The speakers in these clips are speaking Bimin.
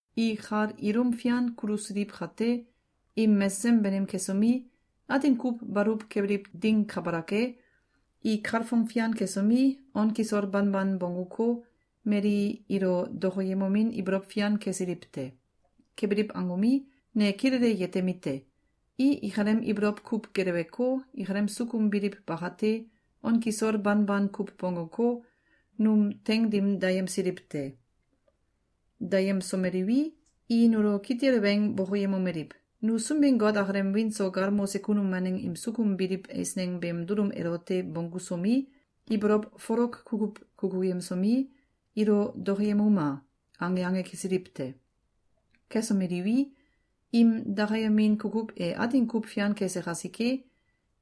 I kal ilum fian kulusiliw kate, im mesesem banim kesomi, atin kuw baluw kebiliw ding kabalak e, i kalfong fian kesomi, on kisol banban bongguko, mali ilo dokoyemomin ibolow fian kesiliw te. Kebiliw angomi, ne kilele yetemite: I ikalem ibolow kuw geleweko, ikalem sukum biliw bakate, on kisol banban kuw bongguko, num teing dim dayemsiliw te. Dayemsomeliwi, i nulo kitil weng bokoyemomeliw: “Nu Sunbin-Got akalem wiin so galmose kunum waneng im sukum biliw eisneng beem dulum elote bonggusomi, ibolow folok kukuw kukuyemsomi, ilo dokoyemuma!”, ange ange kesiliw te. Kesomeliwi, im dakayemin kukuw e atin kuw fian kese kasike,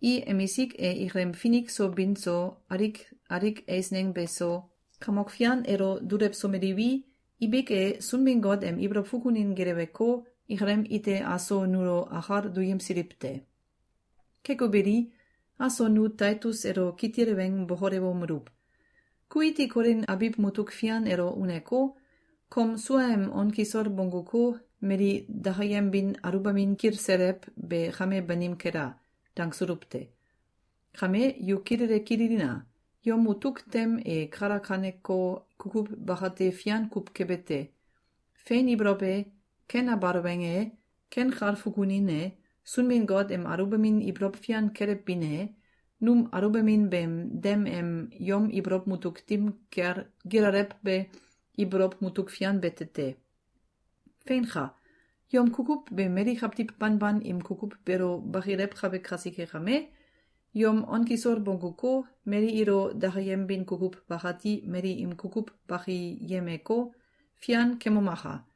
i emisik e ikalem finik so bin so, alik alik eisneng beso, Kamok Fian elo dulewsomeliwi, ibik e, Sunbin-Got em ibolow fukunin geleweko, ikalem ite aso nulo akal duyemsiliw te. Keko beli, aso nu Taitus elo kitil weng bokolewomeluw: “Ku iti Kolin abiw mutuk fian elo uneko, kom suaem on kisol bongguko, mali dakayembin aluwbamin kilselew be kame banim kela!”, dangsuluw te. Kame yu kilele kililina! Yom mutuk tem e kalakaneko kukuw bakate fian kuw kebete: Fein ibolow e, ken abal weng e, ken kal fukunin e, Sunbin-Got em aluwbamin ibolow fian kelewbin e, num aluwbamin beem dem em yom ibolow mutuk dim kel gilalewbe ibolow mutuk fian bete te. Feinka! Yom kukuw be mali kawtiw banban im kukuw beelo bakilewkabe kasike kame, yom on kisol bongguko, mali ilo dakayembin kukuw bakati mali im kukuw bakiyemeko, fian kemomaka!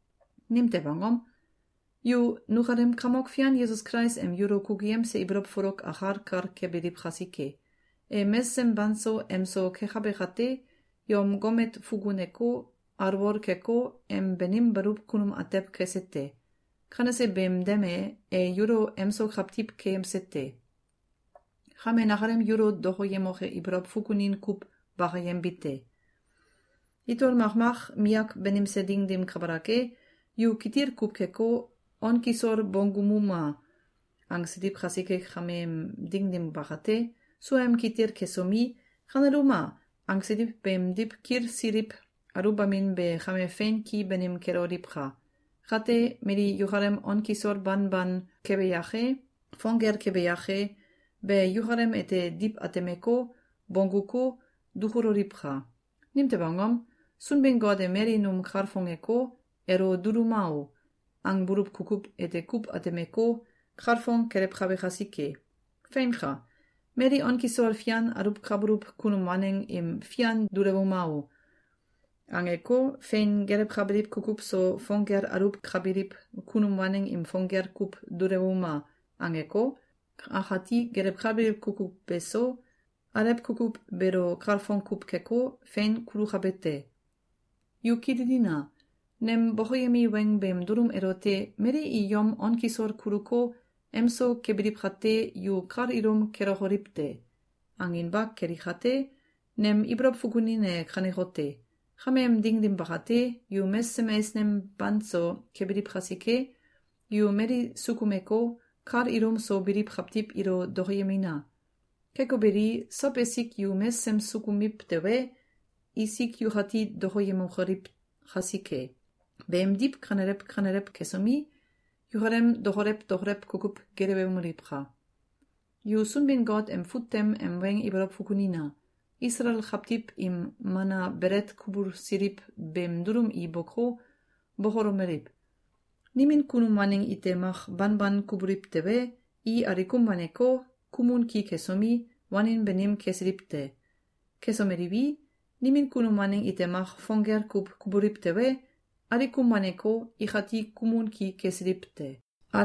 Nimtew angom? Yu nukalem Kamok Fian Yesus Kulais em yulo kukuyemse ibolow folok akal kal kebiliw kasike. E mesesem banso emso kekabe kate, yom gomet fukuneko, alwol keko, em banim baluw kunum atew kese te. Kanese beem dem e, e yulo emso kawtiw keyemse te. Kame nakalem yulo dokoyemoke ibolow fukunin kuw bakayembite: Itol makmak miyak banimse ding dim kabalak e, yu kitil kuw keko, “On kisol bonggumuma!”, angsiliw kasike kameem ding dim bakate, suaem kitil kesomi, “Kaneluma!”, angsiliw beemdiw kilsiliw aluwbamin be kame fein ki banim keloliwka! Kate, mali yukalem on kisol banban kebe yake, fong gel kebe yake, be yukalem ete diw atemeko, bongguko, dukuloliwka! Nimtew angom? Sunbin-Got e mali num kalfongeko, “Elo duluma o!”, angbuluw kukuw ete kuw atemeko, kalfong kelewkabe kasike. Feinka! Mali on kisol fian aluwkabuluw kunum waneng im “Fian dulewuma o!”, angeko, fein gelewkabiliw kukuw so, fong gel aluwkabiliw kunum waneng im “Fong gel kuw dulewuma!”, angeko, akati gelewkabiliw kukuw beso, alew kukuw beelo kalfong kuw keko, fein kulukabe te. Yu kililina! Nem bokoyemi weng beem dulum elote “Mali i yom on kisol kuluko, emso kebiliw kate, yu kal ilum kelokoliw te!”, anginba keli kate, nem ibolow fukunin e kanekote: Kameem ding dim bakate, yu mesesem eisneng banso kebiliw kasike, yu mali sukumeko, kal ilum so biliw kawtiw ilo dokoyemina! Keko beli, sow esik yu mesesem sukumiw tewe, isik yukati dokoyemokoliw kasike. Beemdiw kanelew kanelew kesomi, yukalem dokolew dokolew kukuw gelewemoliwka! Yu Sunbin-Got em fut tem em weng ibolow fukunina! Isalael kawtiw im mana belet kubulsiliw beem dulum i boko, bokolomeliw: “Nimin kunum waneng ite mak banban kubuliw tewe, i alikum waneko, kumun ki kesomi, wanin banim kesiliw te. Kesomeliwi, nimin kunum waneng ite mak fong gel kuw kubuliw tewe, alikum waneko, ikati kumun ki kesiliw te.”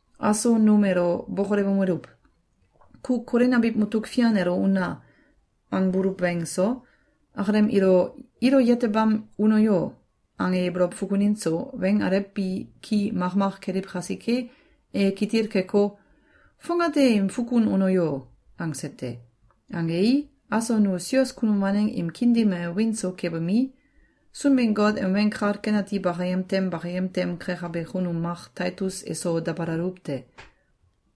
Aso num elo bokolewomeluw: “Ku Kolin abiw mutuk fian elo una!”, angbuluw weng so, akalem “Ilo yetebam uno yo!”, ange ibolow fukunin so, weng alew bi ki makmak keliw kasike, e kitil keko, “Fongate im fukun uno yo!”, angse te. Angei, aso nu sios kunum waneng im kiin dim e wiin so kebomi, Sunbin-Got em Weng Kal Ken Ati bakayem tem bakayem tem kekabe kunum mak Taitus eso dabalaluw te.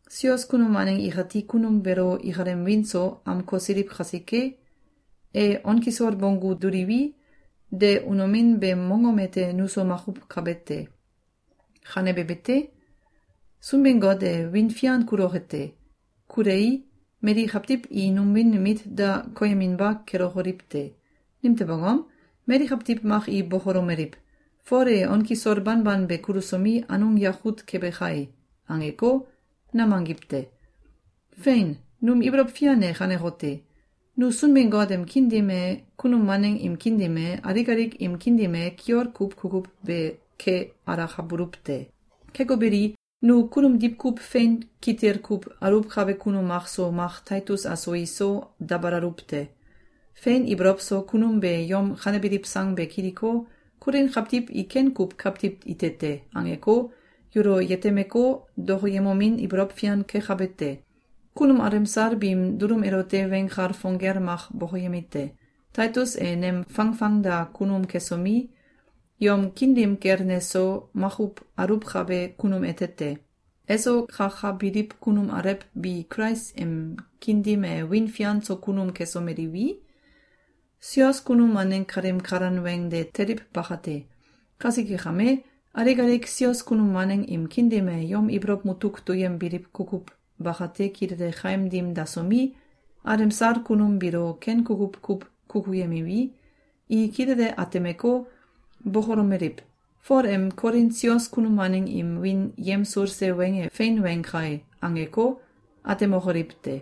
Sios kunum waneng ikati kunum beelo ikalem wiin so amkosiliw kasike, e on kisol bonggu duliwi, de unomin beem mongom ete nuso makuw kabe te. Kanebe bete, Sunbin-Got e wiin fian kuloke te. Kulei, mali kawtiw i num wiin mit da koyeminba kelokoliw te. Nimtew angom? Mali kawtiw mak i bokolomeliw: “Fol e on kisol banban be kulusomi, anung yakut kebe kae!”, angeko, nam angiw te! Fein! Num ibolow fian e kanekote: Nu Sunbin-Got em kiin dim e, kunum waneng im kiin dim e, alik alik im kiin dim e kiol kuw kukuw ke alakabuluw te. Keko beli, nu kunum diwkuw fein kitil kuw aluwkabe kunum makso mak Taitus aso iso, dabalaluw te. Fein ibolow so kunum be yom kanebiliw sang be kiliko, “Kolin kawtiw i ken kuw kawtiw ite te!”, angeko, yulo yetemeko, dokoyemomin ibolow fian kekabe te. Kunum alemsal biim dulum elote weng kal fong gel mak bokoyemite: Taitus e nem fangfangda kunum kesomi, yom kiin dim kel neso makuw aluwkabe kunum ete te. Eso kakabiliw kunum alew bi Kulais em kiin dim e wiin fian so kunum kesomeliwi, sios kunum waneng kalim kalan weng de teliw bakate. Kasike kame, alik alik sios kunum waneng im kiin dim e yom ibolow mutuk duyembiliw kukuw bakate kilele kaim dim dasomi, alemsal kunum biilo ken kukuw kuw kukuyemiwi, i kilele atemeko, bokolomeliw: “Fol em Kolin sios kunum waneng im wiin yemsulse weng e fein weng kae!”, angeko, atemokoliw te.